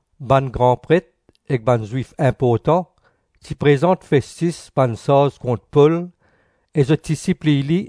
Bann gran Pret ek bann Zwif inportan ti prezant Festis bann sarz kont Pol e zot ti sipliy li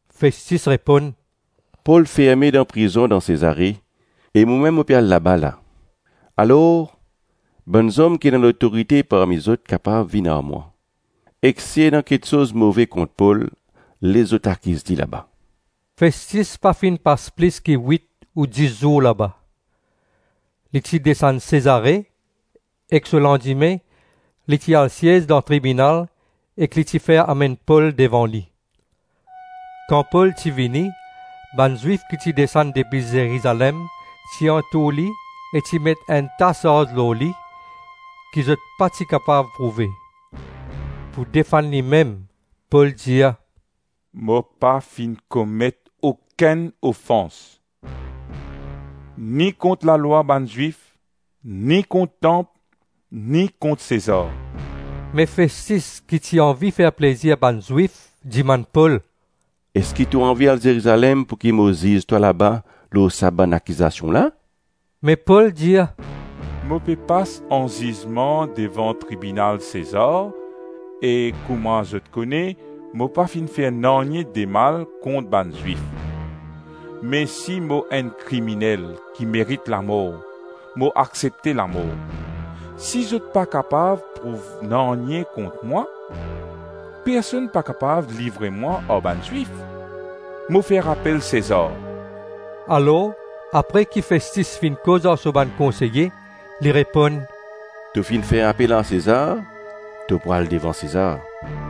Festis reponn, “Pol ferme dan prizon dan Sezare, e momem mo pe al laba la. Alors, bann zom ki ena lotorite parmi zot kapav vinn ar mwa, ek si ena kiksoz move kont Pol les zot akiz li laba.” Festis pa finn pas plis ki wit ou dis zour laba. Li ti desann Sezare, ek so landime li ti al siez dan tribinal ek li ti fer amenn Pol devan li. Kan Pol ti vini, bann Zwif ki ti desann depi Zerizalem ti antour li e ti met enn ta sarz lor li, ki zot pa ti kapav prouve. Pou defann limem Pol dir, “Mo pa finn komet okenn ofans, ni kont lalwa bann Zwif, ni kont tanp, ni kont Sezar.” Me Festis, ki ti anvi fer plezir bann Zwif, dimann Pol, “Eski to anvi al Zerizalem pouki mo ziz twa laba lor sa bann akizasion la?” Me Pol dir, “Mo pe pas anzizman devan tribinal Sezar; e kouma zot kone, mo pa finn fer nanye demal kont bann Zwif. Me si mo enn kriminel ki merit lamor, mo aksepte lamor. Si zot pa kapav prouv nanye kont mwa, personn pa kapav livre mwa ar bann Zwif. Mo fer apel Sezar.” Alors, apre ki Festis finn koz ar so bann konseye, li reponn, “To finn fer apel ar Sezar, to pou al devan Sezar.”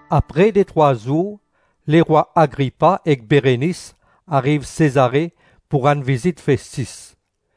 Apre detrwa zour lerwa Agripa ek Berenis ariv Sezare pou rann vizit Festis.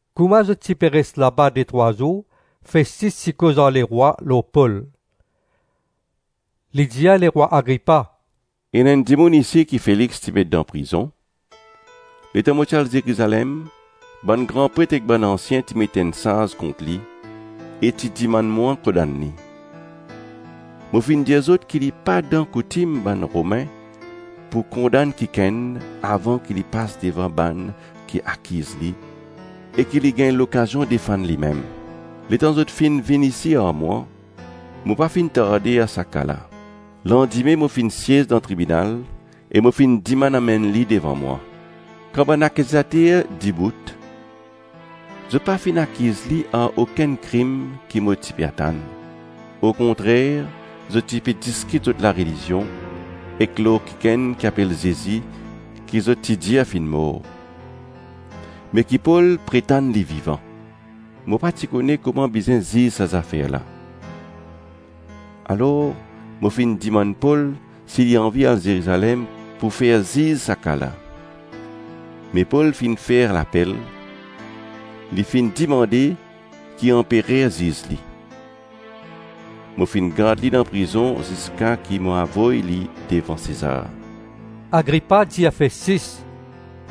Kouma zot ti pe res laba detrwa zour, Festis ti koz ar lerwa lor Pol. Li dir lerwa Agripa, “Ena enn dimoun isi ki Felix ti met dan prizon. Letan mo ti al Zerizalem, bann gran pret ek bann ansien ti met enn sarz kont li e ti dimann mwa kondann li. Mo finn dir zot ki li pa dan koutim bann Romin pou kondann kikenn avan ki li pas devan bann ki akiz li e ki li gagn lokazion defann limem. Letan zot finn vinn isi ar mwa, mo pa finn tarde ar sa ka la. Landime mo finn siez dan tribinal e mo finn dimann amenn li devan mwa. Kan bann akizater dibout, zot pa finn akiz li ar okenn krim ki mo ti pe atann. Okontrer, zot ti pe diskit zot larelizion, ek lor kikenn ki apel Zezi ki zot ti dir finn mor, me ki Pol pretann li vivan. Mo pa ti kone kouma bizin ziz sa zafer la; alors mo finn dimann Pol si li anvi al Zerizalem pou fer ziz sa ka la. Me Pol finn fer lapel. Li finn dimande ki Anperer ziz li. Mo finn gard li dan prizon ziska ki mo avoy li devan Sezar.” Agripa dir Festis,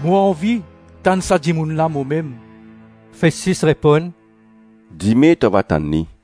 “Mo anvi tann sa dimoun la momem.” Festis reponn, “Dime to ava tann li.”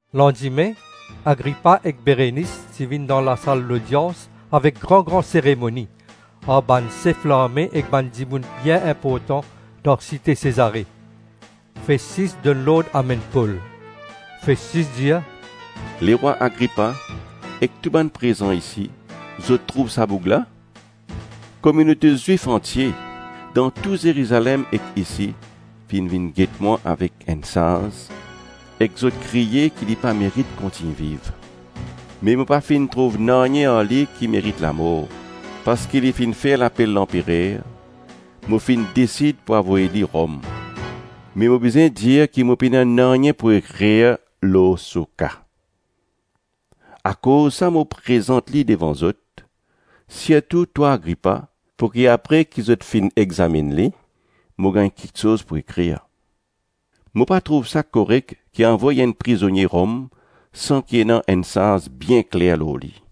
Landime, Agripa ek Berenis ti vinn dan lasal lodians avek gran-gran seremoni, ar bann sef larme ek bann dimoun bien inportan dan site Sezare. Festis donn lord amenn Pol. Festis dir, “Lerwa Agripa, e tou bann ki prezan isi, zot trouv sa boug la? Kominote Zwif antie, dan Zerizalem ek isi, finn vinn get mwa avek enn sarz, ek zot kriye ki li pa merit kontign viv. Me mo pa finn trouv nanye ar li ki merit lamor. Parski li finn fer lapel Lanperer, mo finn desid pou avoy li Rom. Me mo bizin dir ki mo pena nanye pou ekrir lor so ka. Akoz sa mo prezant li devan zot, sirtou twa Agripa, pouki apre ki zot finn examinn li, mo gagn kiksoz pou ekrir. Mo pa trouv sa korek ki avoy enn prizonie Rom san ki ena enn sarz bien kler lor li.”